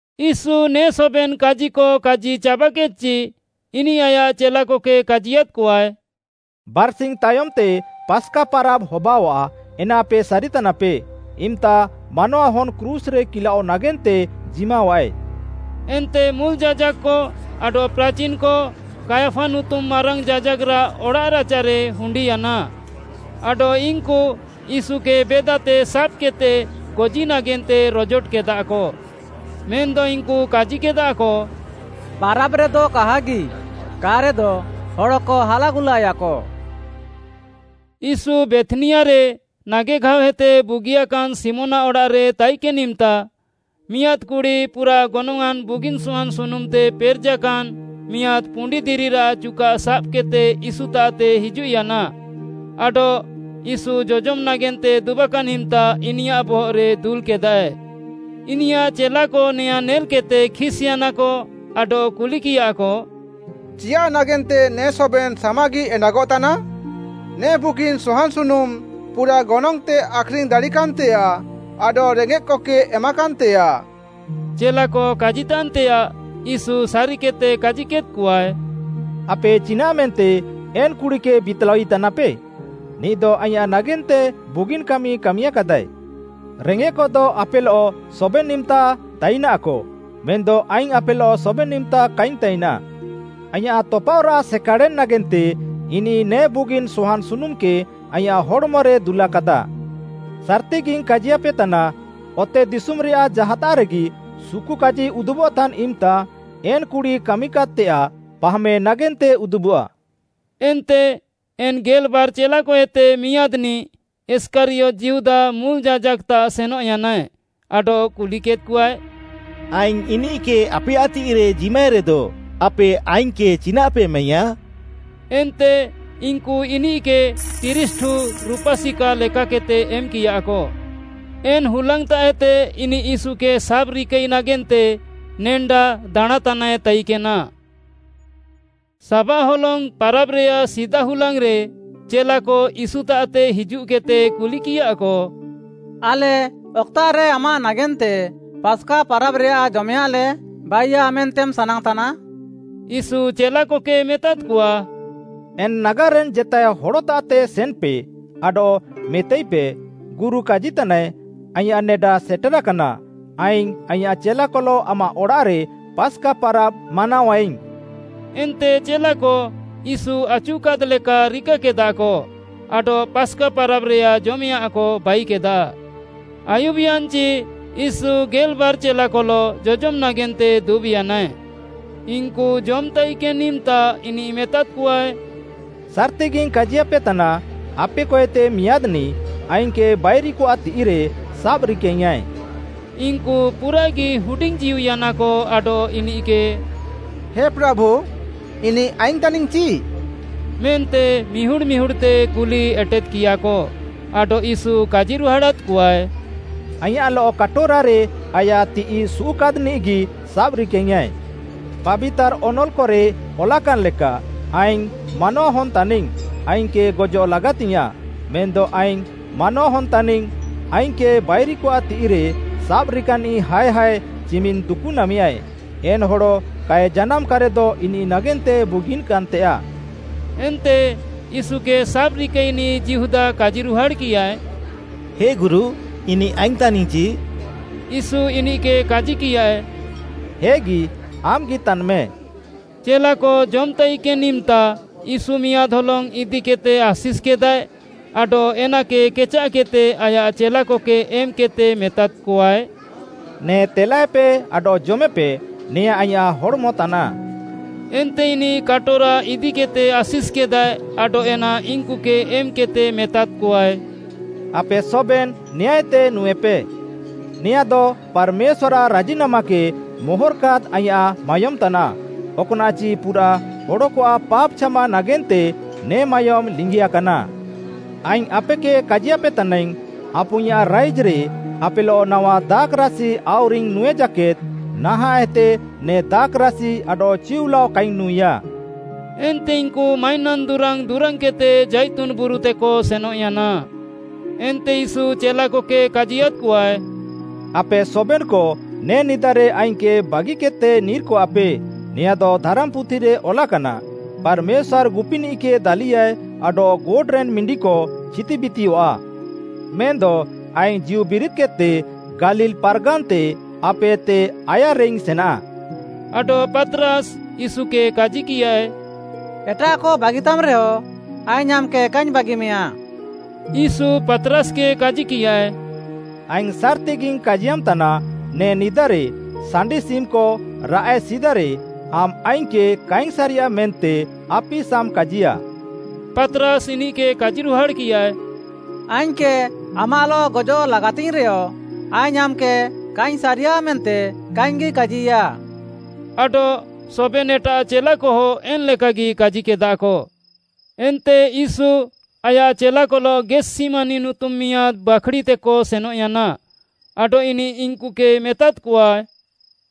ୟୀଶୁ ନେ ସବେନ୍‌ କାଜିକ କାଜି ଚାବାକେଦ୍‍ଚି, ଇନିଃ ଆୟାଃ ଚେଲାକକେ କାଜିୟାଦ୍‍କଆଏ, “ବାର୍‍ସିଙ୍ଗ୍‌ ତାୟମ୍‌ତେ ପାସ୍‌କା ପାରାବ୍‌ ହବାଅଆଃ ଏନା ଆପେ ସାରିତାନାପେ। ଇମ୍‌ତା ମାନୱାହନ୍‌ କ୍ରୁଶ୍‌ରେ କିଲାଅଃ ନାଗେନ୍ତେ ଜିମାଃୱାଏ।” ଏନ୍ତେ ମୁଲ୍‌ ଯାଜାକ୍‌କ, ଆଡଃ ପ୍ରାଚିନ୍‌କ, କାୟଫା ନୁତୁମ୍‌ ମାରାଙ୍ଗ୍‌ ଯାଜାକ୍‌ରାଃ ଅଡ଼ାଃରାଚାରେ ହୁଣ୍ଡିୟାନା। ଆଡଃ ଇନ୍‌କୁ ୟୀଶୁକେ ବେଦାତେ ସାବ୍‌କେଦ୍‌ତେ ଗଜି ନାଗେନ୍ତେ ରଜୋଟକେଦାକ। ମେନ୍‌ଦ ଇନ୍‌କୁ କାଜିକେଦାକ, “ପାରାବ୍‍ରେଦ କାହାଗି, କା'ରେଦ ହଡ଼କ ହାଲାଗୁଲାୟାକ।” ୟୀଶୁ ବେଥ୍‌ନିଆରେ ନାଗେଘାଅଏତେ ବୁଗିଆକାନ୍‌ ଶିମୋନ୍‌ଆଃ ଅଡ଼ାଃରେ ତାଇକେନ୍‌ ଇମ୍‌ତା, ମିଆଁଦ୍‌ କୁଡ଼ି ପୁରାଃ ଗନଙ୍ଗ୍‌ଆଁନ୍‌ ବୁଗିନ୍‌ ସହାନ୍‌ ସୁନୁମ୍‌ତେ ପେରେଜାକାନ୍‍ ମିଆଁଦ୍‌ ପୁଣ୍ଡିଦିରିରାଃ ଚୁକାଃ ସାବ୍‌କେଦ୍‌ତେ ୟୀଶୁତାଃତେ ହିଜୁଃୟାନା, ଆଡଃ ୟୀଶୁ ଜଜମ୍ ନାଗେନ୍ତେ ଦୁବାକାନ୍‌ ଇମ୍‌ତା ଇନିୟାଃ ବହଃରେ ଦୁଲ୍‍କେଦାଏ। ଇନିୟାଃ ଚେଲାକ ନେଆଁଁ ନେଲ୍‍କେଦ୍‍ତେ ଖିସ୍‍ୟାନାକ ଆଡଃ କୁଲିକିୟାକ, “ଚିୟାଃ ନାଗେନ୍ତେ ନେ ସବେନ୍‌ ସାମାଗି ଏଣ୍ଡାଗଃତାନା? ନେ ବୁଗିନ୍‌ ସହାନ୍‌ ସୁନୁମ୍‌ ପୁରାଃ ଗନଙ୍ଗ୍‌ତେ ଆଖ୍‌ରିଙ୍ଗ୍‌ ଦାଡ଼ିକାନ୍‌ତେୟାଃ ଆଡଃ ରେଙ୍ଗେଃକକେ ଏମାକାନ୍‌ତେୟାଃ।” ଚେଲାକ କାଜିତାନ୍‌ତେୟାଃ ୟୀଶୁ ସାରିକେଦ୍‌ତେ କାଜିକେଦ୍‍କଆଏ, “ଆପେ ଚିନାଃମେନ୍ତେ ଏନ୍‍ କୁଡ଼ିକେ ବିତ୍‍ଲାଇତାନାପେ? ନିଃଦ ଆଇଁୟାଃ ନାଗେନ୍ତେ ବୁଗିନ୍‌ କାମି କାମିକାଦାଏ। ରେଙ୍ଗେଃକଦ ଆପେଲଃ ସବେନ୍‌ ଇମ୍‌ତା ତାଇନାଃକ ମେନ୍‌ଦ ଆଇଙ୍ଗ୍‌ ଆପେଲଃ ସବେନ୍‌ ଇମ୍‌ତା କାଇଙ୍ଗ୍‌ ତାଇନା। ଆଇଁୟାଃ ତପାଅଃରାଃ ସେକାଡ଼େନ୍‌ ନାଗେନ୍ତେ ଇନିଃ ନେ ବୁଗିନ୍‌ ସହାନ୍‌ ସୁନୁମ୍‌କେ ଆଇଁୟାଃ ହଡ଼୍‌ମରେ ଦୁଲାକାଦା। ସାର୍‌ତିଗିଙ୍ଗ୍‌ କାଜିୟାପେତାନା, ଅତେଦିଶୁମ୍‌ରେୟାଃ ଜାହାତାଃରେଗି ସୁକୁକାଜି ଉଦୁବଃତାନ୍‌ ଇମ୍‌ତା ଏନ୍‌ କୁଡ଼ି କାମିକାଦ୍‍ତେୟାଃ ପାହାମେ ନାଗେନ୍ତେ ଉଦୁବଃଆ।” ଏନ୍ତେ ଏନ୍‍ ଗେଲ୍‌ବାର୍‌ ଚେଲାକଏତେ ମିଆଁଦ୍‌ନିଃ, ଇଷ୍କାରିୟତ୍‌ ଯିହୁଦା ମୁଲ୍‌ ଯାଜାକ୍‌କତାଃ ସେନଃୟାନାଏ, ଆଡଃ କୁଲିକେଦ୍‌କଆଏ, “ଆଇଙ୍ଗ୍‌ ଇନିଃକେ ଆପେୟାଃ ତିଃଇରେ ଜିମାଇରେଦ ଆପେ ଆଇଙ୍ଗ୍‌କେ ଚିନାଃପେ ଏମାଇୟାଁ?” ଏନ୍ତେ ଇନ୍‌କୁ ଇନିଃକେ ତିରିଶ୍‌ଠୁ ରୁପା ସିକା ଲେକାକେଦ୍‌ତେ ଏମ୍‌କିୟାକ। ଏନ୍‍ ହୁଲାଙ୍ଗ୍‌ତାଃଏତେ ଇନିଃ ୟୀଶୁକେ ସାବ୍‍ରିକାଇ ନାଗେନ୍ତେ ସୁଯୋଗ୍‌ ଦାଣାଁଁତାନାଏ ତାଇକେନା। ସାବାଃ ହଲଙ୍ଗ୍‌ ପାରାବ୍‌ରେୟାଃ ସିଦା ହୁଲାଙ୍ଗ୍‌ରେ ଚେଲାକ ୟୀଶୁତାଃତେ ହିଜୁଃକେଦ୍‌ତେ କୁଲିକିୟାକ, “ଆଲେ ଅକ୍‌ତାଃରେ ଆମାଃ ନାଗେନ୍ତେ ପାସ୍‌କା ପାରାବ୍‌ରେୟାଃ ଜମେୟାଃଁଲେ ବାଇୟା ମେନ୍ତେମ୍‌ ସାନାଙ୍ଗ୍‌ତାନା?” ୟୀଶୁ ଚେଲାକକେ ମେତାଦ୍‌କଆ, “ଏନ୍‍ ନାଗାର୍‌ରେନ୍‌ ଜେତାଏ ହଡ଼ତାଃତେ ସେନ୍‍ପେ ଆଡଃ ମେତାଇପେ, ‘ଗୁରୁ କାଜିତାନାଏ, ଆଇଁୟାଃ ନେଡା ସେଟେରାକାନା, ଆଇଙ୍ଗ୍‌ ଆଇଁୟାଃ ଚେଲାକଲଃ ଆମାଃ ଅଡ଼ାଃରେ ପାସ୍‌କା ପାରାବ୍‌ ମାନାଅୟାଇଙ୍ଗ୍‌।’” ଏନ୍ତେ ଚେଲାକ ୟୀଶୁ ଆଚୁକାଦ୍‍ଲେକା ରିକାକେଦାକ ଆଡଃ ପାସ୍‌କା ପାରାବ୍‌ରେୟାଃ ଜମେୟାଁଃକ ବାଇକେଦା। ଆୟୁବ୍‍ୟାନ୍‍ଚି ୟୀଶୁ ଗେଲ୍‌ବାର୍‌ ଚେଲାକଲଃ ଜଜମ୍‌ ନାଗେନ୍ତେ ଦୁବ୍‍ୟାନାଏ। ଇନ୍‌କୁ ଜମ୍‌ତାଇକେନ୍‌ ଇମ୍‌ତା ଇନିଃ ମେତାଦ୍‌କଆଏ, “ସାର୍‌ତିଗିଙ୍ଗ୍‌ କାଜିୟାପେତାନା, ଆପେକଏତେ ମିଆଁଦ୍‌ନିଃ ଆଇଙ୍ଗ୍‌କେ ବାଇରିକଆଃ ତିଃଇରେ ସାବ୍‍ରିକାଇଙ୍ଗ୍‌ୟାଁଏ।” ଇନ୍‌କୁ ପୁରାଃଗି ହୁଡିଙ୍ଗ୍‌ଜୀଉୟାନାକ ଆଡଃ ଇନିଃକେ “ହେ ପ୍ରାଭୁ, ଇନିଃ ଆଇଙ୍ଗ୍‌ ତାନିଙ୍ଗ୍‌ଚି?” ମେନ୍ତେ ମିହୁଡ଼୍‌ ମିହୁଡ଼୍‌ତେ କୁଲି ଏଟେଦ୍‌କିୟାକ। ଆଡଃ ୟୀଶୁ କାଜିରୁହାଡ଼ାଦ୍‍କଆଏ, “ଆଇଁୟାଃଲଃ କାଟୋରାରେ ଆୟାଃ ତିଃଇ ସୁଉଃକାଦ୍‌ନିଃଗି ସାବ୍‍ରିକାଇଙ୍ଗ୍‌ୟାଁଏ। ପାବିତାର୍‌ ଅନଲ୍‌କରେ ଅଲାକାନ୍‌ ଲେକା, ଆଇଙ୍ଗ୍‌ ମାନୱାହନ୍‌ ତାନିଙ୍ଗ୍‌, ଆଇଙ୍ଗ୍‌କେ ଗଜଃଲାଗାତିୟାଃଁ। ମେନ୍‌ଦ ଆଇଙ୍ଗ୍‌ ମାନୱାହନ୍‌ ତାନିଙ୍ଗ୍‌, ଆଇଙ୍ଗ୍‌କେ ବାଇରିକଆଃ ତିଃଇରେ ସାବ୍‌ରିକାନିଃ ହାୟ୍ ହାୟ୍ ଚିମିନ୍‌ ଦୁକୁନାମେୟାଏ। ଏନ୍‌ ହଡ଼ କାଏ ଜାନାମ୍‌କାନ୍‌ରେଦ ଇନିଃ ନାଗେନ୍ତେ ବୁଗିକାନ୍‌ତେଆଃ।” ଏନ୍ତେ ୟୀଶୁକେ ସାବ୍‌ରିକାଇନିଃ ଯିହୁଦା କାଜିରୁହାଡ଼୍‌କିୟାଏ, “ହେ ଗୁରୁ, ଇନିଃ ଆଇଙ୍ଗ୍‌ ତାନିଙ୍ଗ୍‌ଚି?” ୟୀଶୁ ଇନିଃକେ କାଜିକିୟାଏ, “ହେଗି, ଆମ୍‌ଗି ତାନ୍‌ମେ।” ଚେଲାକ ଜମ୍‌ତାଇକେନ୍‌ ଇମ୍‌ତା ୟୀଶୁ ମିଆଁଦ୍‌ ହଲଙ୍ଗ୍‌ ଇଦିକେଦ୍‌ତେ ଆଶିଷ୍‌କେଦାଏ ଆଡଃ ଏନାକେ କେଚାଃକେଦ୍‌ତେ ଆୟାଃ ଚେଲାକକେ ଏମ୍‌କେଦ୍‌ତେ ମେତାଦ୍‌କଆଏ, “ନେ ତେଲାଏପେ ଆଡଃ ଜମେପେ, ନେଆଁଁ ଆଇଁୟାଃ ହଡ଼୍‌ମ ତାନାଃ।” ଏନ୍ତେ ଇନିଃ କାଟୋରା ଇଦିକେଦ୍‌ତେ ଆଶିଷ୍‌କେଦାଏ ଆଡଃ ଏନା ଇନ୍‌କୁକେ ଏମ୍‌କେଦ୍‌ତେ ମେତାଦ୍‌କଆଏ, “ଆପେ ସବେନ୍‌ ନେଆଁଁଏତେ ନୁଁଏପେ। ନେଆଁଦ ପାର୍‌ମେଶ୍ୱାର୍‌ଆଃ ରାଜିନାମାକେ ମୋହର୍‌କାଦ୍‌ ଆଇଁୟାଃ ମାୟୋମ୍‌ ତାନାଃ। ଅକ୍‌ନାଃଚି ପୁରାଃ ହଡ଼କଆଃ ପାପ୍‌ ଛାମା ନାଗେନ୍ତେ ନେ ମାୟୋମ୍‌ ଲିଙ୍ଗିଆକାନା। ଆଇଙ୍ଗ୍‌ ଆପେକେ କାଜିୟାପେ ତାନାଇଙ୍ଗ୍‌, ଆପୁଇଁୟାଃ ରାଇଜ୍‌ରେ ଆପେଲଃ ନାୱା ଦାଖ୍‌ରାସି ଆଉରିଙ୍ଗ୍‌ ନୁଁଇ ଜାକେଦ୍‌, ନାହାଁଃଏତେ ନେ ଦାଖ୍‌ରାସି ଆଡଃ ଚିଉଲାଅ କାଇଙ୍ଗ୍‌ ନୁଁଇଆ।” ଏନ୍ତେ ଇନ୍‌କୁ ମାଇନାନ୍‌ ଦୁରାଙ୍ଗ୍‌ ଦୁରାଙ୍ଗ୍‌କେଦ୍‌ତେ ଜାଇତୁନ୍‌ ବୁରୁତେକ ସେନଃୟାନା। ଏନ୍ତେ ୟୀଶୁ ଚେଲାକକେ କାଜିୟାଦ୍‍କଆଏ, “ଆପେ ସବେନ୍‌କ ନେ ନିଦାରେ ଆଇଙ୍ଗ୍‌କେ ବାଗିକେଦ୍‌ତେ ନିର୍‌କଆଃପେ, ନେଆଁଦ ଧାରାମ୍‌ପୁଥିରେ ଅଲାକାନା, ‘ପାର୍‌ମେଶ୍ୱାର୍‌ ଗୁପିନିଃକେ ଦାଲିୟାଏ ଆଡଃ ଗୋଟ୍‌ରେନ୍‍ ମିଣ୍ଡିକ ଛିତିବିତିୟଃଆ।’ ମେନ୍‌ଦ ଆଇଙ୍ଗ୍‌ ଜୀଉବିରିଦ୍‌କେଦ୍‌ତେ ଗାଲିଲ୍‌ ପାର୍‌ଗାନ୍‌ତେ ଆପେଏତେ ଆୟାର୍‌ରେଇଙ୍ଗ୍‌ ସେନାଃ।” ଆଡଃ ପାତ୍‌ରାସ୍‌ ୟୀଶୁକେ କାଜିକିୟାଏ, “ଏଟାଃକ ବାଗିତାମ୍‌ରେହଁ, ଆଇଙ୍ଗ୍‌ ଆମ୍‌କେ କାଇଙ୍ଗ୍‌ ବାଗିମେଆ।” ୟୀଶୁ ପାତ୍‌ରାସ୍‌କେ କାଜିକିୟାଏ, “ଆଇଙ୍ଗ୍‌ ସାର୍‌ତିଗିଙ୍ଗ୍‌ କାଜିୟାମ୍‌ତାନା, ନେ ନିଦାରେ ସାଣ୍ଡିସିମ୍‌କ ରାଃଏ ସିଦାରେ ଆମ୍‌ ଆଇଙ୍ଗ୍‌କେ କାଇଙ୍ଗ୍‌ ସାରିୟା ମେନ୍ତେ ଆପିସାମ୍‌ କାଜିୟା।” ପାତ୍‌ରାସ୍‌ ଇନିଃକେ କାଜିରୁହାଡ଼୍‌କିୟାଏ, “ଆଇଙ୍ଗ୍‌କେ ଆମାଃଲଃ ଗଜଃ ଲାଗାତିଙ୍ଗ୍‌ରେୟ ଆଇଙ୍ଗ୍‌ ଆମ୍‌କେ କାଇଙ୍ଗ୍‌ ସାରିୟା ମେନ୍ତେ କାଇଙ୍ଗ୍‌ଗି କାଜିୟା,” ଆଡଃ ସବେନ୍‌ ଏଟାଃ ଚେଲାକହ ଏନ୍‍ଲେକାଗି କାଜିକେଦାକ। ଏନ୍ତେ ୟୀଶୁ ଆୟାଃ ଚେଲାକଲଃ ଗେଥ୍‌ସିମାନି ନୁତୁମ୍‌ ମିଆଁଦ୍‌ ବାଖ୍‌ଡ଼ିତେକ ସେନଃୟାନା, ଆଡଃ ଇନିଃ ଇନ୍‌କୁକେ ମେତାଦ୍‌କଆଏ,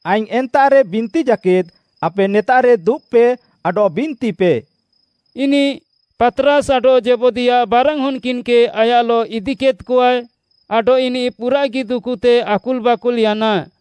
“ଆଇଙ୍ଗ୍‌ ଏନ୍ତାଃରେ ବିନ୍ତି ଜାକେଦ୍‌ ଆପେ ନେତାଃରେ ଦୁବ୍‍ପେ ଆଡଃ ବିନ୍ତିପେ।” ଇନିଃ ପାତ୍‌ରାସ୍‌ ଆଡଃ ଜେବଦୀୟାଃ ବାରାନ୍‌ ହନ୍‌କିନ୍‌କେ ଆୟାଃଲଃ ଇଦିକେଦ୍‌କଆଏ, ଆଡଃ ଇନିଃ ପୁରାଃଗି ଦୁକୁତେ ଆକୁଲ୍‌ବାକୁଲ୍‌ୟାନା,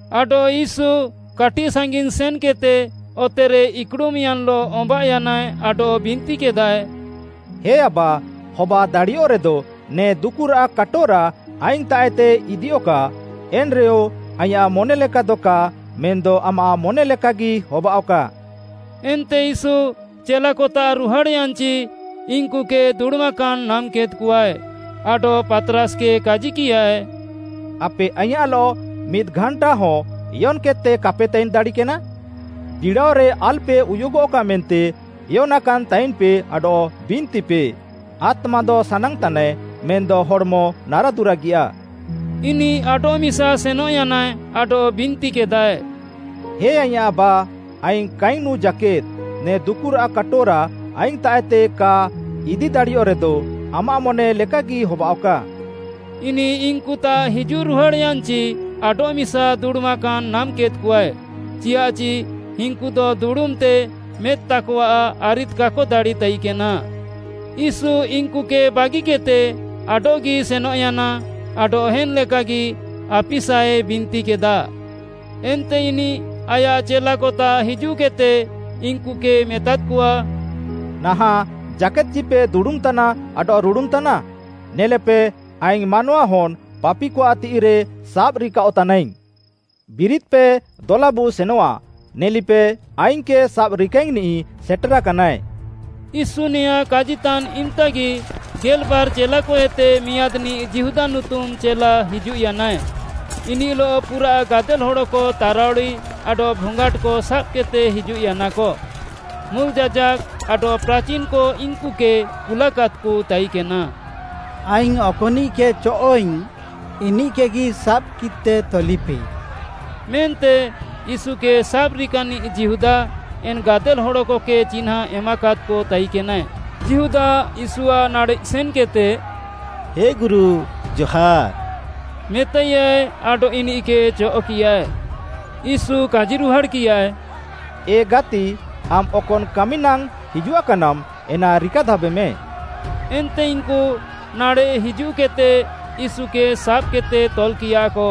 ଆଡଃ ୟୀଶୁ କାଟିଃ ସାଙ୍ଗିନ୍‌ ସେନ୍‌କେଦ୍‌ତେ ଅତେରେ ଇକ୍‌ଡ଼ୁମ୍‌ୟାନ୍‌ଲଃ ଅମ୍ବାଃୟାନାଏ ଆଡଃ ବିନ୍ତିକେଦାଏ, “ହେ ଆବା, ହବାଦାଡ଼ିୟଃରେଦ ନେ ଦୁକୁରାଃ କାଟୋରା ଆଇଙ୍ଗ୍‌ତାଃଏତେ ଇଦିୟଃକା, ଏନ୍‌ରେୟ ଆଇଁୟାଃ ମନେଲେକାଦ କା ମେନ୍‌ଦ ଆମାଃ ମନେଲେକାଗି ହବାଅଃକା।” ଏନ୍ତେ ୟୀଶୁ ଚେଲାକତାଃ ରୁହାଡ଼୍‌ୟାନ୍‌ଚି ଇନ୍‌କୁକେ ଦୁଡ଼ୁମାକାନ୍‌ ନାମ୍‍କେଦ୍‍କଆଏ, ଆଡଃ ପାତ୍‌ରାସ୍‌କେ କାଜିକିୟାଏ, “ଆପେ ଆଇଁୟାଃଲଃ ମିଦ୍‌ଘାଣ୍ଟାହଁ ଏୟନ୍‌କେଦ୍‌ତେ କାପେ ତାଇନ୍‌ ଦାଡ଼ିକେନା? ବିଡ଼ାଅରେ ଆଲ୍‌ପେ ଉୟୁଗଃକା ମେନ୍ତେ ଏୟନାକାନ୍‌ ତାଇନ୍‌ପେ ଆଡଃ ବିନ୍ତିପେ। ଆତ୍ମାଦ ସାନାଙ୍ଗ୍‌ତାନାଏ, ମେନ୍‌ଦ ହଡ଼୍‌ମ ନାରାଦୁରାଗିୟାଃ।” ଇନିଃ ଆଡଃମିସା ସେନଃୟାନାଏ ଆଡଃ ବିନ୍ତିକେଦାଏ, “ହେ ଆଇଁୟାଃ ଆବା, ଆଇଙ୍ଗ୍‌ କାଇଙ୍ଗ୍‌ ନୁଁ ଜାକେଦ୍‌ ନେ ଦୁକୁରାଃ କାଟୋରା ଆଇଙ୍ଗ୍‌ତାଃଏତେ କା ଇଦି ଦାଡ଼ିୟଃରେଦ, ଆମାଃ ମନେ ଲେକାଗି ହବାଅଃକା।” ଇନିଃ ଇନ୍‌କୁତାଃ ହିଜୁଃରୁହାଡ଼୍‌ୟାନ୍‌ଚି ଆଡଃମିସା ଦୁଡ଼ୁମାକାନ୍‌ ନାମ୍‍କେଦ୍‍କଆଏ, ଚିୟାଃଚି ଇନ୍‍କୁଦ ଦୁଡ଼ୁମ୍‍ତେ ମେଦ୍‌ତାକଆଃ ଆରିଦ୍‌ କାକ ଦାଡ଼ିତାଇକେନା। ୟୀଶୁ ଇନ୍‌କୁକେ ବାଗିକେଦ୍‌ତେ ଆଡଃଗି ସେନଃୟାନା ଆଡଃ ଏନ୍‍ ଲେକାଗି ଆପିସାଏ ବିନ୍ତିକେଦା। ଏନ୍ତେ ଇନିଃ ଆୟାଃ ଚେଲାକତାଃ ହିଜୁଃକେଦ୍‌ତେ ଇନ୍‌କୁକେ ମେତାଦ୍‌କଆ, “ନାହାଁଃ ଜାକେଦ୍‌ଚିପେ ଦୁଡ଼ୁମ୍‍ତାନା ଆଡଃ ରୁଡ଼ୁନ୍‌ତାନା? ନେଲେପେ, ଆଇଙ୍ଗ୍‌ ମାନୱାହନ୍‌ ପାପିକଆଃ ତିଃଇରେ ସାବ୍‌ରିକାଅଃତାନାଇଙ୍ଗ୍‌। ବିରିଦ୍‌ପେ, ଦଲାବୁ ସେନଆଃ! ନେଲିପେ, ଆଇଙ୍ଗ୍‌କେ ସାବ୍‍ରିକାଇଙ୍ଗ୍‌ନିଃ ସେଟେରାକାନାଏ।” ୟୀଶୁ ନେଆଁଁ କାଜିତାନ୍ ଇମ୍‍ତାଗି ଗେଲ୍‌ବାର୍‌ ଚେଲାକଏତେ ମିଆଁଦ୍‌ନିଃ ଯିହୁଦା ନୁତୁମ୍‌ ଚେଲା ହିଜୁଃୟାନାଏ, ଇନିଃଲଃ ପୁରାଃ ଗାଦେଲ୍‌ ହଡ଼କ ତାରାଉଡ଼ି ଆଡଃ ଭଙ୍ଗାଟ୍‌କ ସାବ୍‌କେଦ୍‌ତେ ହିଜୁଃୟାନାକ। ମୁଲ୍‌ ଯାଜାକ୍‌କ ଆଡଃ ପ୍ରାଚିନ୍‌କ ଇନ୍‌କୁକେ କୁଲାକାଦ୍‌କ ତାଇକେନା। “ଆଇଙ୍ଗ୍‌ ଅକ୍‌ନିଃକେ ଚଅଃ'ଇଙ୍ଗ୍‌ ଇନିଃକେଗି ସାବ୍‌କିତେ ତଲିପେ” ମେନ୍ତେ ୟୀଶୁକେ ସାବ୍‍ରିକାନିଃ ଯିହୁଦା ଏନ୍‌ ଗାଦେଲ୍‌ ହଡ଼କକେ ଚିହ୍ନାଁ ଏମାକାଦ୍‌କ ତାଇକେନାଏ। ଯିହୁଦା, ୟୀଶୁଆଃ ନାଡ଼େଃ ସେନ୍‌କେଦ୍‌ତେ, “ହେ ଗୁରୁ, ଜହାର୍‌” ମେତାଇୟାଏ ଆଡଃ ଇନିଃକେ ଚଅଃ'କିୟାଏ। ୟୀଶୁ କାଜିରୁହାଡ଼୍‌କିୟାଏ, “ଏ ଗାତି ଆମ୍‌ ଅକନ୍‌ କାମିନାଙ୍ଗ୍‌ ହିଜୁଆକାନାମ୍‌ ଏନା ରିକାଧାବେମେ।” ଏନ୍ତେ ଇନ୍‌କୁ ନାଡ଼େଃ ହିଜୁଃକେଦ୍‌ତେ ୟୀଶୁକେ ସାବ୍‌କେଦ୍‌ତେ ତଲ୍‌କିୟାଃକ।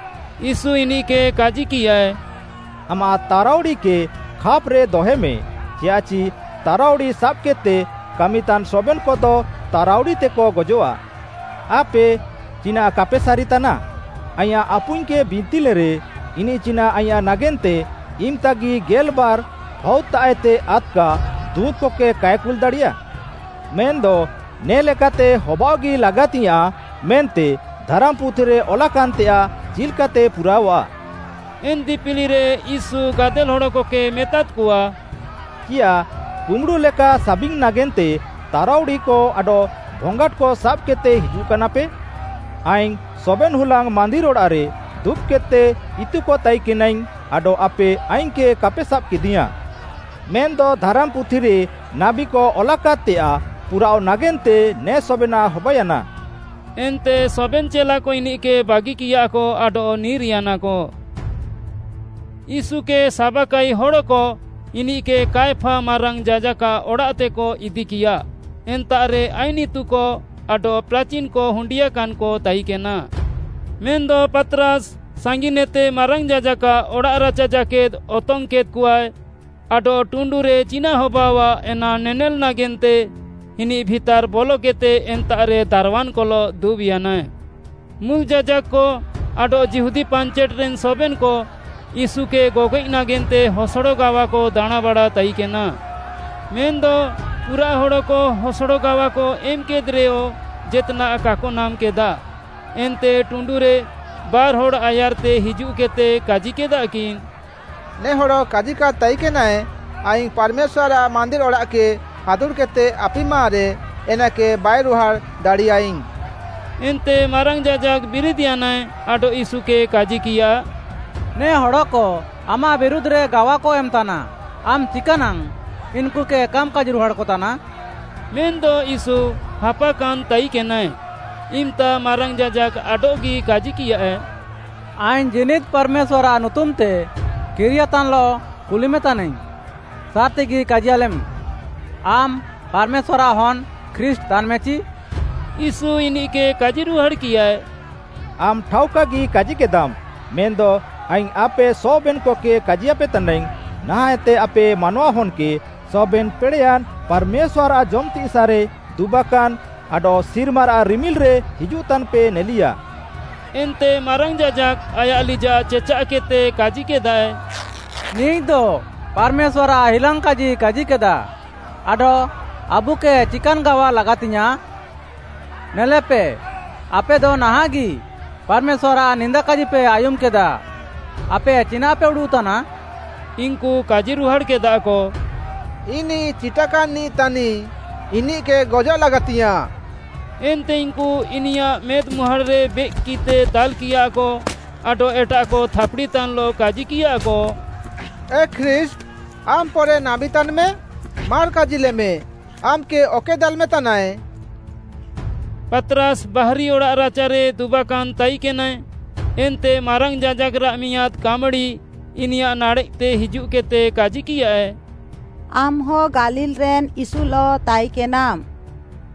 ୟୀଶୁ ଇନିଃକେ କାଜିକିୟାଏ, “ଆମାଃ ତାରାଉଡ଼ିକେ ଖାପ୍‍ରେ ଦହଏମେ, ଚିୟାଃଚି ତାରାଉଡ଼ି ସାବ୍‌କେଦ୍‌ତେ କାମିତାନ୍ ସବେନ୍‍କଦ ତାରାଉଡ଼ିତେକ ଗଜଃଆ। ଆପେ ଚିନାଃ କାପେ ସାରିତାନା, ଆଇଁୟାଃ ଆପୁଇଙ୍ଗ୍‌କେ ବିନ୍ତିଲେରେ, ଇନିଃ ଚିନାଃ ଆଇଁୟାଃ ନାଗେନ୍ତେ ଇମ୍‌ତାଗି ଗେଲ୍‌ବାର୍‌ ଫାଉଦ୍‌ତାଃଏତେ ଆଦ୍‌କା ଦୁଁତ୍‌କକେ କାଏ କୁଲ୍‌ଦାଡ଼ିୟା? ମେନ୍‌ଦ ନେ ଲେକାତେ ହବାଅଃଗି ଲାଗାତିଙ୍ଗ୍‌ୟାଁଃ ମେନ୍ତେ ଧାରାମ୍‌ପୁଥିରେ ଅଲାକାନ୍‌ତେୟାଃ ଚିଲ୍‌କାତେ ପୁରାଅଃଆ।” ଏନ୍‌ ଦିପିଲିରେ ୟୀଶୁ ଗାଦେଲ୍‌ ହଡ଼କକେ ମେତାଦ୍‌କଆ, “ଚିୟାଃ କୁମ୍ବୁଡ଼ୁ ଲେକା ସାବିଙ୍ଗ୍‌ ନାଗେନ୍ତେ ତାରାଉଡ଼ିକ ଆଡଃ ଭଙ୍ଗାଟ୍‌କ ସାବ୍‌କେଦ୍‌ତେ ହିଜୁଃକାନାପେ? ଆଇଙ୍ଗ୍‌ ସବେନ୍‌ ହୁଲାଙ୍ଗ୍‌ ମାନ୍ଦିର୍‌ ଅଡ଼ାଃରେ ଦୁବ୍‌କେଦ୍‌ତେ ଇତୁକ ତାଇକେନାଇଙ୍ଗ୍‌ ଆଡଃ ଆପେ ଆଇଙ୍ଗ୍‌କେ କାପେ ସାବ୍‌କେଦିୟାଁ। ମେନ୍‌ଦ ଧାରାମ୍‌ପୁଥିରେ ନାବୀକ ଅଲାକାଦ୍‌ତେୟାଃ ପୁରାଅଃ ନାଗେନ୍ତେ ନେ ସବେନାଃ ହବାୟାନା।” ଏନ୍ତେ ସବେନ୍‌ ଚେଲାକ ଇନିଃକେ ବାଗିକିୟାକ ଆଡଃ ନିର୍‌ୟାନାକ। ୟୀଶୁକେ ସାବାକାଇ ହଡ଼କ ଇନିଃକେ କାୟଫା ମାରାଙ୍ଗ୍‌ ଯାଜାକ୍‌ଆଃ ଅଡ଼ାଃତେକ ଇଦିକିୟା, ଏନ୍ତାଃରେ ଆଇନ୍‌ ଇତୁକ ଆଡଃ ପ୍ରାଚିନ୍‌କ ହୁଣ୍ଡିୟାକାନ୍‍କ ତାଇକେନା। ମେନ୍‌ଦ ପାତ୍‌ରାସ୍‌ ସାଙ୍ଗିନ୍‍ଏତେ ମାରାଙ୍ଗ୍‌ ଯାଜାକ୍‌ଆଃ ଅଡ଼ାଃରାଚା ଜାକେଦ୍‌ ଅତଙ୍ଗ୍‌କେଦ୍‌କଆଏ ଆଡଃ ଟୁଣ୍ଡୁରେ ଚିନାଃ ହବାଅଆଃ ଏନା ନେନେଲ୍‌ ନାଗେନ୍ତେ ଇନିଃ ଭିତାର୍‌ ବଲକେଦ୍‌ତେ ଏନ୍ତାଃରେ ଦାରୱାନ୍‌କଲଃ ଦୁବ୍‍ୟାନାଏ। ମୁଲ୍‌ ଯାଜାକ୍‌କ ଆଡଃ ଯିହୁଦୀ ପାଞ୍ଚେଟ୍‌ରେନ୍ ସବେନ୍‌କ ୟୀଶୁକେ ଗଗଏଃ ନାଗେନ୍ତେ ହସଡ଼ ଗାୱାକ ଦାଣାଁଁବାଡ଼ା ତାଇକେନା। ମେନ୍‌ଦ ପୁରାଃ ହଡ଼କ ହସଡ଼ ଗାୱାକ ଏମ୍‌କେଦ୍‌ରେୟ ଜେତ୍‌ନାଃ କାକ ନାମ୍‌କେଦା, ଏନ୍ତେ ଟୁଣ୍ଡୁରେ ବାର୍‌ହଡ଼୍‌ ଆୟାର୍‌ତେ ହିଜୁଃକେଦ୍‌ତେ କାଜିକେଦାକିନ୍‌, “ନେ ହଡ଼ କାଜିକାଦ୍‌ ତାଇକେନାଏ, ‘ଆଇଙ୍ଗ୍‌ ପାର୍‌ମେଶ୍ୱାର୍‌ଆଃ ମାନ୍ଦିର୍‌ ଅଡ଼ାଃକେ ହାଦୁଡ଼୍‌କେଦ୍‌ତେ ଆପିମାରେ ଏନାକେ ବାଇରୁହାଡ଼୍‌ ଦାଡ଼ିୟାଇଙ୍ଗ୍‌।’” ଏନ୍ତେ ମାରାଙ୍ଗ୍‌ ଯାଜାକ୍‌ ବିରିଦ୍‌ୟାନାଏ ଆଡଃ ୟୀଶୁକେ କାଜିକିୟା, “ନେ ହଡ଼କ ଆମାଃ ବିରୁଧ୍‌ରେ ଗାୱାକ ଏମ୍‌ତାନା, ଆମ୍‌ ଚିକାନାଙ୍ଗ୍‌ ଇନ୍‌କୁକେ କାମ୍‌ କାଜିରୁହାଡ଼୍‌କତାନା?” ମେନ୍‌ଦ ୟୀଶୁ ହାପାକାନ୍‍ ତାଇକେନାଏ, ଇମ୍‌ତା ମାରାଙ୍ଗ୍‌ ଯାଜାକ୍‌ ଆଡଃଗି କାଜିକିୟାଏ, “ଆଇଙ୍ଗ୍‌ ଜୀନିଦ୍‌ ପାର୍‌ମେଶ୍ୱାର୍‌ଆଃ ନୁତୁମ୍‌ତେ କିରିୟାନ୍‌ତାନ୍‌ଲଃ କୁଲିମେ ତାନାଇଙ୍ଗ୍‌, ସାର୍‌ତିଗି କାଜିୟାଲେମ୍‌, ଆମ୍‌ ପାର୍‌ମେଶ୍ୱାର୍‌ଆଃ ହନ୍‌ ଖ୍ରୀଷ୍ଟ୍‌ ତାନ୍‍ମେଚି?” ୟୀଶୁ ଇନିଃକେ କାଜିରୁହାଡ଼୍‌କିୟାଏ, “ଆମ୍‌ ଠାଉକାଗି କାଜିକେଦାମ୍‌, ମେନ୍‌ଦ ଆଇଙ୍ଗ୍‌ ଆପେ ସବେନ୍‌କକେ କାଜିୟାପେ ତାନାଇଙ୍ଗ୍‌, ନାହାଁଃଏତେ ଆପେ ମାନୱାହନ୍‌କେ ସବେନ୍‌ ପେଡ଼େୟାନ୍‌ ପାର୍‌ମେଶ୍ୱାର୍‌ଆଃ ଜମ୍‌ତିସାଃରେ ଦୁବାକାନ୍‌ ଆଡଃ ସିର୍ମାରାଃ ରିମିଲ୍‌ରେ ହିଜୁଃତାନ୍‍ପେ ନେଲିୟା।” ଏନ୍ତେ ମାରାଙ୍ଗ୍‌ ଯାଜାକ୍‌ ଆୟାଃ ଲିଜାଃ ଚେଚାଃକେଦ୍‍ତେ କାଜିକେଦାଏ, “ନିଃଦ ପାର୍‌ମେଶ୍ୱାର୍‌ଆଃ ହିଲାଙ୍ଗ୍‌କାଜି କାଜିକେଦା, ଆଡଃ ଆବୁକେ ଚିକାନ୍‌ ଗାୱା ଲାଗାତିଙ୍ଗ୍‌ୟାଁଃ? ନେଲେପେ, ଆପେଦ ନାହାଁଃଗି ପାର୍‌ମେଶ୍ୱାର୍‌ଆଃ ନିନ୍ଦାକାଜିପେ ଆୟୁମ୍‌କେଦା, ଆପେ ଚିନାଃପେ ଉଡ଼ୁଃତାନା?” ଇନ୍‌କୁ କାଜିରୁହାଡ଼୍‌କେଦାକ, “ଇନିଃ ଚିଟାକାନ୍‌ନିଃ ତାନିଃ, ଇନିଃକେ ଗଜଃ ଲାଗାତିଙ୍ଗ୍‌ୟାଁଃ।” ଏନ୍ତେ ଇନ୍‌କୁ ଇନିୟାଃ ମେଦ୍‌ମୁହାଁଡ଼୍‌ରେ ବେଏକ୍‌କିତେ ଦାଲ୍‌କିୟାକ ଆଡଃ ଏଟାଃକ ଥାପ୍‌ଡ଼ିତାନ୍‍ଲଃ କାଜିକିୟାକ, “ଏ ଖ୍ରୀଷ୍ଟ୍‌! ଆମ୍‌ ପରେ ନାବୀ ତାନ୍‌ମେ, ମାର୍‌ କାଜିଲେମେ, ଆମ୍‌କେ ଅକଏ ଦାଲ୍‌ମେତାନାଏ?” ପାତ୍‌ରାସ୍‌ ବାହାରି ଅଡ଼ାଃରାଚାରେ ଦୁବାକାନ୍‌ ତାଇକେନାଏ, ଏନ୍ତେ ମାରାଙ୍ଗ୍‌ ଯାଜାକ୍‌ରାଃ ମିଆଁଦ୍‌ କାମ୍‌ଡ଼ି ଇନିୟାଃ ନାଡ଼େଃତେ ହିଜୁଃକେଦ୍‌ତେ କାଜିକିୟାଏ, “ଆମ୍‌ହ ଗାଲିଲ୍‌ରେନ୍‍ ୟୀଶୁଲଃ ତାଇକେନାମ୍‌।”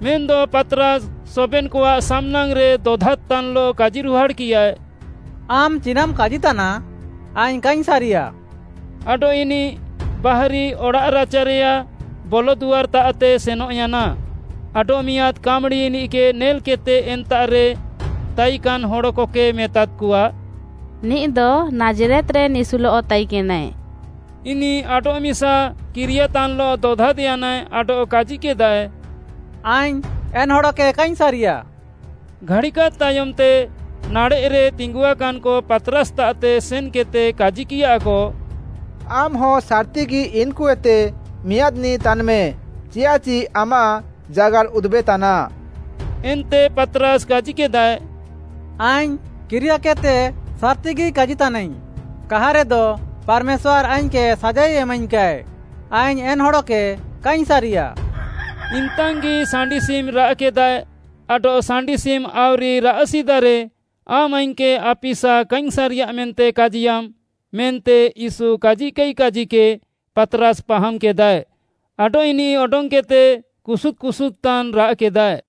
ମେନ୍‌ଦ ପାତ୍‌ରାସ୍‌ ସବେନ୍‌କଆଃ ସାମ୍‌ନାଙ୍ଗ୍‌ରେ ଦଦାଦ୍‌ତାନ୍‌ଲଃ କାଜିରୁହାଡ଼୍‌କିୟାଏ, “ଆମ୍‌ ଚିନାଃମ୍‌ କାଜିତାନା ଆଇଙ୍ଗ୍‌ କାଇଙ୍ଗ୍‌ ସାରିୟା।” ଆଡଃ ଇନିଃ ବାହାରି ଅଡ଼ାଃରାଚାରେୟାଃ ବଲଦୁଆର୍‌ତାଃତେ ସେନଃୟାନା। ଆଡଃମିଆଁଦ୍‌ କାମ୍‌ଡ଼ି ଇନିଃକେ ନେଲ୍‍କେଦ୍‍ତେ ଏନ୍ତାଃରେ ତାଇକାନ୍‌ ହଡ଼କକେ ମେତାଦ୍‌କଆ, “ନିଃଦ ନାଜ୍‌ରେତ୍‌ରେନ୍‌ ୟୀଶୁଲଃ ତାଇକେନାଏ।” ଇନିଃ ଆଡଃମିସା କିରିୟାତାନ୍‌ଲଃ ଦଦାଦ୍‌ୟାନାଏ ଆଡଃ କାଜିକେଦାଏ, “ଆଇଙ୍ଗ୍‌ ଏନ୍‍ ହଡ଼କେ କାଇଙ୍ଗ୍‌ ସାରିୟା।” ଘାଡ଼ିକାଦ୍‍ ତାୟମ୍‌ତେ ନାଡ଼େଃରେ ତିଙ୍ଗୁଆକାନ୍‍କ ପାତ୍‌ରାସ୍‌ତାଃତେ ସେନ୍‌କେଦ୍‌ତେ କାଜିକିୟାକ, “ଆମ୍‌ହ ସାର୍‌ତିଗି ଇନ୍‌କୁଏତେ ମିଆଁଦ୍‌ନିଃ ତାନ୍‌ମେ, ଚିୟାଃଚି ଆମାଃ ଜାଗାର୍‌ ଉଦୁବେତାନା।” ଏନ୍ତେ ପାତ୍‌ରାସ୍‌ କାଜିକେଦାଏ, “ଆଇଙ୍ଗ୍‌ କିରିୟାକେଦ୍‌ତେ ସାର୍‌ତିଗି କାଜିତାନାଇଙ୍ଗ୍‌, କାହାରେଦ ପାର୍‌ମେଶ୍ୱାର୍‌ ଆଇଙ୍ଗ୍‌କେ ସାଜାଇ ଏମାଇଙ୍ଗ୍‌କାଏ, ଆଇଙ୍ଗ୍‌ ଏନ୍‌ ହଡ଼କେ କାଇଙ୍ଗ୍‌ ସାରିୟା,” ଇମ୍‌ତାଙ୍ଗି ସାଣ୍ଡିସିମ୍‌ ରାଆଃକେଦାଏ, ଆଡଃ “ସାଣ୍ଡିସିମ୍‌ ଆଉରି ରାଆଃ ସିଦାରେ ଆମ୍‌ ଆଇଙ୍ଗ୍‌କେ ଆପିସା କାଇଙ୍ଗ୍‌ ସାରିୟା ମେନ୍ତେ କାଜିୟାମ୍‌” ମେନ୍ତେ ୟୀଶୁ କାଜିକାଇ କାଜିକେ ପାତ୍‌ରାସ୍‌ ପାହାମ୍‍କେଦାଏ ଆଡଃ ଇନିଃ ଅଡଙ୍ଗ୍‌କେଦ୍‌ତେ କୁସୁଦ୍‌ କୁସୁଦ୍‌ତାନ୍‌ ରାଆଃକେଦାଏ।